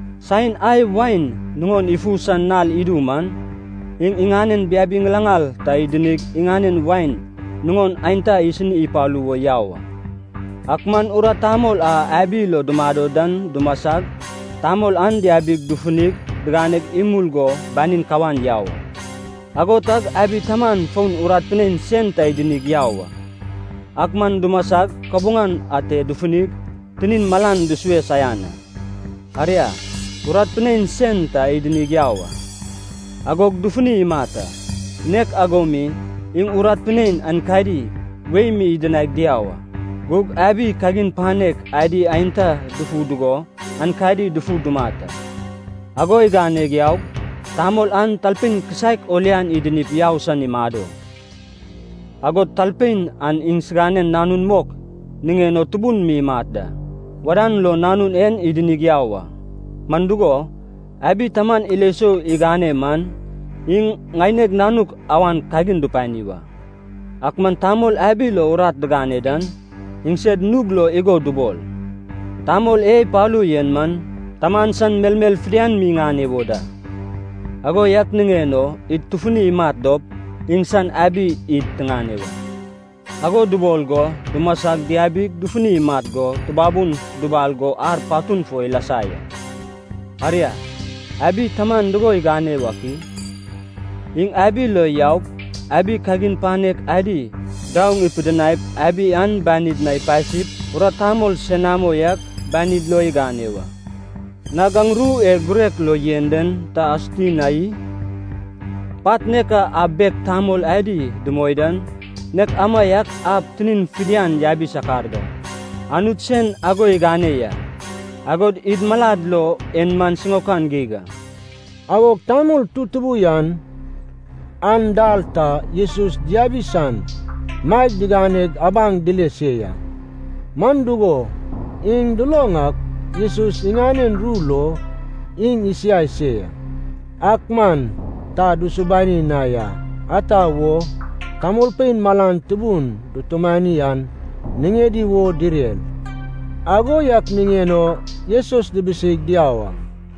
Saen ai wain nuŋon ifu san nal idu man, iŋ iŋanen biabi ŋilaŋal ta idinig iŋanen wain nuŋon aenta isini ipalu wo yau a. Ak man urat tamol a abi lo dumado dan dumasag, tamol an diabig dufunig digane imul go banin kawan yau a. Ago tag abi taman fon urat pinein sen ta idinig yau a. Ak man dumasag kabuŋan ate dufunig tinin malan dusue saian a. Aria, urat pinein sen ta idinig yau a. Agog dufuni imat a. Nek ago mi, iŋ urat pinein aenkadi wei mi idinaig diau a. Gug abi kagin panek adi aenta dufu dugo aenkadi dufu dumat a. “Ago igane yaug tamol an talpein kisaek o lian idinip yau san imado. Agod talpein an iŋsiganen nanun mok niŋen o tubun mi imat da. Wadan lo nanun en idinig yau a, man dugo, abi taman ilo sou igane man, ‘Iŋ ŋaineg nanuk awan kagin dupani wa.’ “Ak man tamol abi lo urat digane dan, iŋsed nug lo igo dubol, ‘Tamol e ipalu yen man taman san melmel fidian mi iŋane wo da. Ago yak niŋen o id tufunip imat dop, iŋsan abi id tiŋane wa.’ Ago dubol go dumasag diabig dufunig imat go tubabun dubal go ar patun fo ilasa ya. “Aria, abi taman dugo igane wak i? Iŋ abi lo yaup abi kagin panek adi daoŋ ipidinaip abi an banid na ipasip urat tamol senamo yak banid lo igane wa. Nag aŋ ru e girek lo yen den ta asuti na i? ‘Pat nek a ab bek tamol adi dumoi dan, nek amaiak ab tinin fidian yabi sakar da. Anut sen ago igane ya, agod id malad lo en man siŋaokan geig a.’” Agog tamol tutubu yan an dal ta Jesus diabi san maeg diganeg abaŋ dile se ya. Man dugo, iŋ duloŋ ak Jesus iŋanen ru lo iŋ isiai se ya. Ak man ta dusubani na ya, ata wo, tamolpein malan tubun dutumani an niŋedi wo direr, ago yak niŋen o Jesus dibiseig diau a.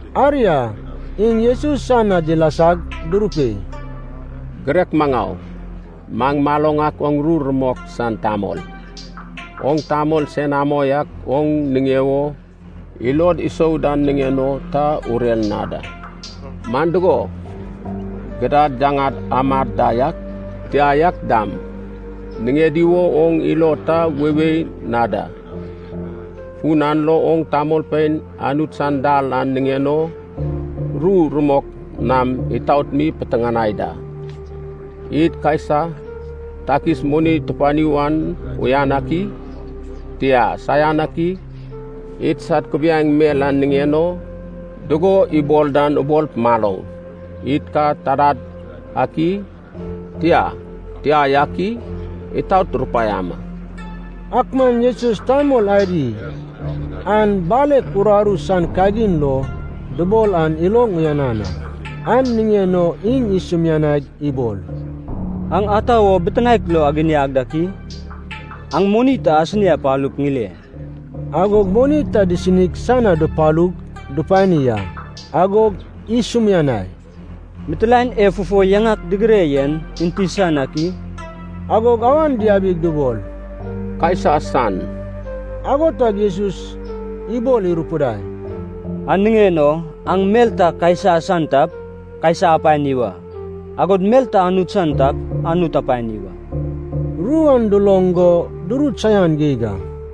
Aria, iŋ Jesus san na dilasag durupei, “Girek maŋau, maŋ maloŋ ak oŋ ru rumok san tamol. Oŋ tamol senamo yak oŋ niŋe wo ilod isou dan niŋen o ta urer na da. Man dugo, gidad yaŋad amad da yak, tia yak dam, niŋedi wo oŋ ilo ta weiwei na da. Fun an lo oŋ tamolpein Anut san dal an niŋen o ru rumok nam itaot mi piteŋanai da. Id Kaisa takis moni tupani wan uyan ak i? Tia, saian ak i? Idsad kubiaeŋ mel en niŋen o dugo ibol dan ubol maloŋ. Id ka tadad ak i? Tia, tia yak i? Itaot rupaiama.” Ak man Jesus tamol adi an balek rararu san kagin lo dubol an iloŋ uyanan a. An niŋen o iŋ isumianaig ibol, “Aŋ ata wo bitinaek lo aginiag dak i? Aŋ moni ta asini apalup ŋile.” Agog moni ta disinig san na dupalug dupani a. Agog isumianai, “Mitilaen e fufo yaŋak digire yen enti san ak i?” Agog awan diabig dubol, “Kaisa san.” Ago tag Jesus ibol irupidai, “An niŋen o aŋ mel ta Kaisa san tap, Kaisa apani wa, agod mel ta Anut san tap, Anut apani wa.” Ru an duloŋ go durut saian geig a.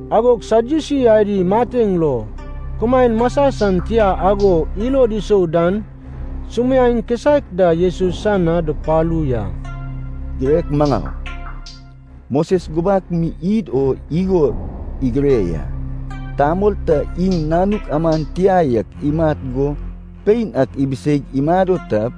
Agog Sadyusi adi mateŋ lo kumaen masa san tia ago ilod isou dan sumiaeŋ kisaek da Jesus san na dupalu ya. “Girek maŋau, Moses gubak mi id o igo igire ya. Tamol ta iŋ nanuk aman tia yak imat go pein ak ibiseig imado tap,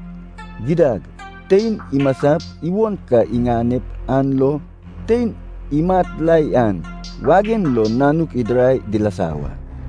gidad tein imasap iwon ka iŋanep an lo tein imat la yan wagen lo nanuk idirai dilasa wa.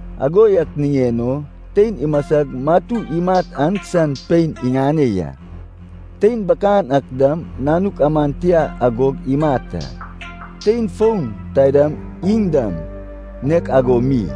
Ago yak niŋen o tein imasag matu imat an san pein iŋane ya. Tein bakan ak dam nanuk aman tia agog imat a, tein fon taidam iŋ dam nek ago mi,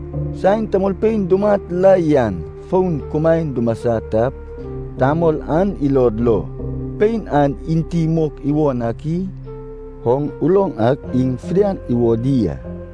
Saen tamolpein dumat la yan fon kumaen dumasa tap, tamol an ilod lo pein an enti mok iwon ak i? Oŋ uloŋ ak iŋ fidian iwodi a.”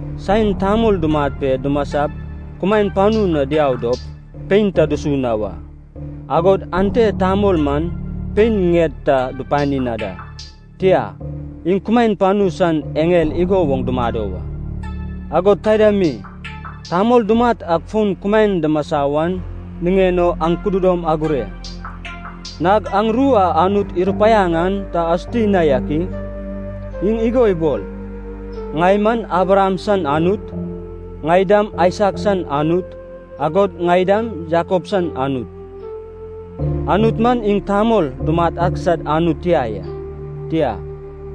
Saen tamol dumat pe dumasap kumaen panu na diau dop, pein ta dusu na wa, agod ante tamol man pein ŋied ta dupani na da. Tia, iŋ kumaen panu san eŋel igo woŋ dumado wa. Agod taida mi, tamol dumat ak fon kumaen dumasa wan niŋen o aŋ kududom agure. Nag aŋ ru a Anut irupaiaŋ an ta asuti na yak i? Iŋ igo ibol, ‘Ŋai man Abraham san Anut, ŋai dam Aisak san Anut, agod ŋai dam Jakob san Anut.’ Anut man iŋ tamol dumat ak sad Anut tia ya. Tia,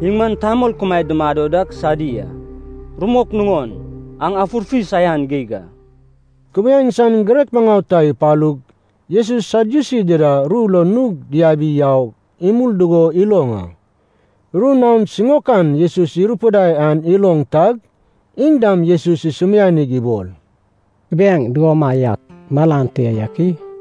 iŋ man tamol kumaed dumado dak sadi a. Rumok nuŋon, aŋ afurfi saian geig a!” Kubiaeŋ san girek maŋau ta ipalug Jesus Sadyusi dida ru lo nug diabi yau imul dugo iloŋ a. Ru naon siŋaokan Jesus irupidai an iloŋ tag, iŋ dam Jesus isumianig ibol, “Kubiaeŋ dugomaiak malan te yak i?”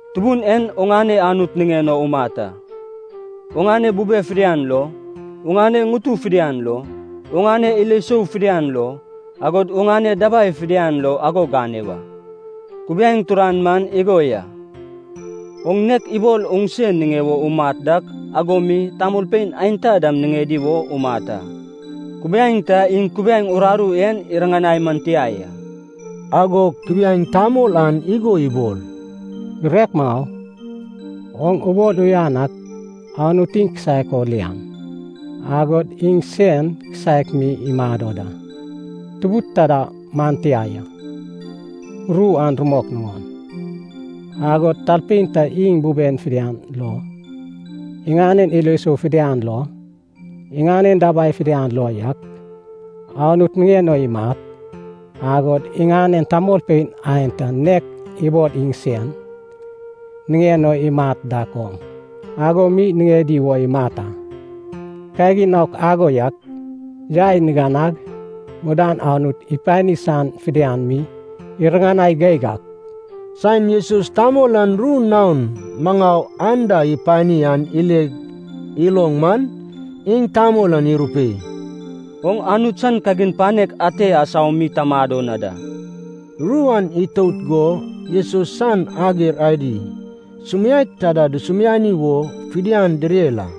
Tubun en oŋane Anut niŋen o umat a, oŋane bube fidian lo, oŋane ŋutu fidian lo, oŋane ilo sou fidian lo, agod oŋane dabai fidian lo ago gane wa.’ Kubiaeŋ turan man igo ya. ‘Oŋ nek ibol oŋse niŋe wo umat dak ago mi tamolpein aenta dam niŋedi wo umat a.’ Kubiaeŋ ta iŋ kubiaeŋ uraru en iriŋanai man tia ya.” Agog kubiaeŋ tamol an igo ibol, “Girek maŋau, oŋ ubol uyanan ak, Anut iŋ kisaek o lian, agod iŋ sen kisaek mi imado da, tubud taida man tia ya, ru an rumok nuŋon. Agod talpein ta iŋ buben fidian lo, iŋanen ilo sou fidian lo, iŋanen dabai fidian lo yak Anut niŋen o imat, agod iŋanen tamolpein aenta nek ibol iŋsen niŋen o imat dak oŋ, ago mi niŋedi wo imat a. Kagin naok ago yak, yai niganag mudan Anut ipani san fidian mi iriŋanai geig a.” Saen Jesus tamol an ru naon maŋau anda ipani an ile iloŋ man, iŋ tamol an irupei, “Oŋ Anut san kagin panek ate asau mi ta mado na da.” Ru an itout go Jesus san ager adi sumiaek taida dusumiani wo fidian direr a.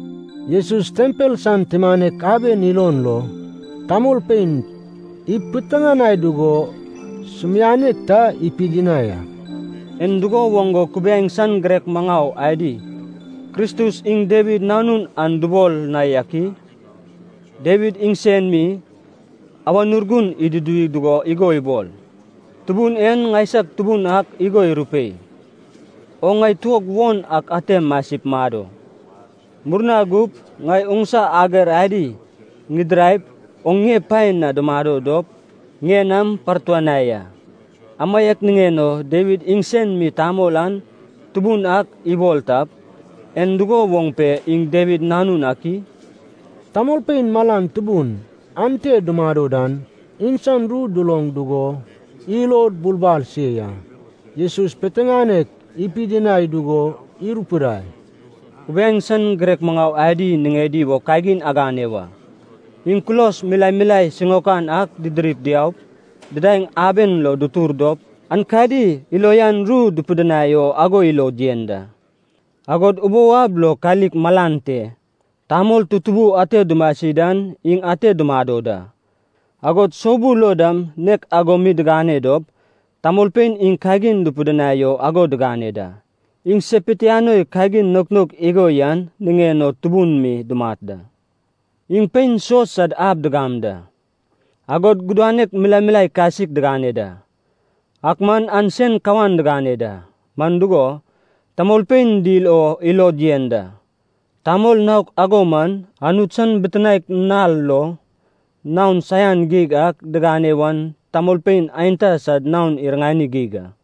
Jesus tempel san tumanek aben ilon lo tamolpein ipiteŋanai dugo sumianek ta ipidinai a. “En dugo woŋ go kubiaeŋ san girek maŋau adi, Kristus iŋ Dawid nanun an dubol na yak i? Dawid iŋsen mi, Awan Urgun iduduwi dugo igo ibol: ‘Tubun en ŋaisag Tubun ak igo irupei, “Oŋ ŋai tuog won ak ate masip mado, murna gup ŋai oŋsa ager adi ŋidiraip, oŋ ŋie pae na dumado dop ŋie nam partuanai a.” ’ Amaiak niŋen o Dawid iŋsen mi tamol an Tubun ak ibol tap, en dugo woŋ pe iŋ Dawid nanun ak i?” Tamolpein malan tubun ante dumado dan iŋsan ru duloŋ dugo ilod bulbal se ya. Jesus piteŋanek ipidinai dugo irupidai, “Kubiaeŋ san girek maŋau adi niŋedi wo kagin agane wa. Iŋ kulos milae milae siŋaokan ak didirip diaup didaeŋ aben lo dutor dop aenkadi ilo uyan ru dupidinai o ago ilod yen da. Agod ubou ab lo kalik malan te tamol tutubu ate dumasi dan iŋ ate dumado da. Agod soubul lo dam nek ago mi digane dop, tamolpein iŋ kagin dupidinai o ago digane da. Iŋ se pitianoi kagin naok naok igo yan niŋen o tubun mi dumat da. Iŋ pein suos sad ab digam da. Agod gudanek milae milae kasik digane da, ak man an sen kawan digane da, man dugo, tamolpein dil o ilod yen da. Tamol naok ago man Anut san bitinaek nal lo naon saian geig a diŋane wan tamolpein aenta sad naon iriŋani geig a.”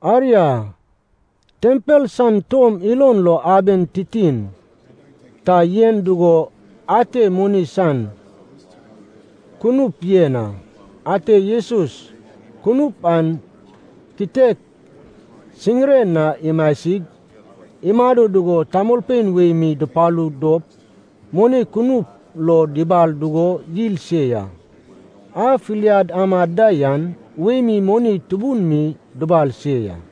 Aria, tempel san tom ilon lo aben titin ta yen dugo ate moni san kunup yen a. Ate Jesus kunup an kitek siŋiren na imasig imado dugo tamolpein wei mi dupalu dop moni kunup lo dubal dugo yil se ya. A filiad amad da yan wei mi moni tubun mi dubal se ya.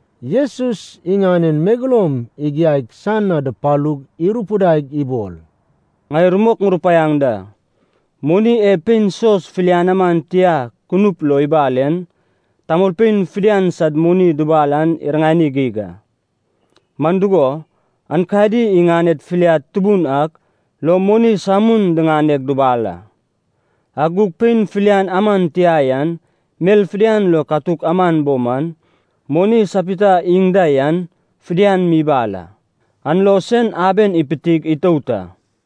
Jesus iŋanen megeloum igiaig san na dupalug irupidaig ibol, “Ŋai rumok ŋurupaiaŋ da. Moni e pein suos filian aman tia kunup lo ibal en, tamolpein fidian sad moni dubal an iriŋani geig a. Man dugo, aenkadi iŋaned filiad tubun ak lo moni samun diŋaneg dubal a. Ak gug pein filian aman tia yan mel fidian lo katuk aman bo man, moni sapita iŋ da yan fidian mi ibal a. An lo sen aben ipitig itout a.”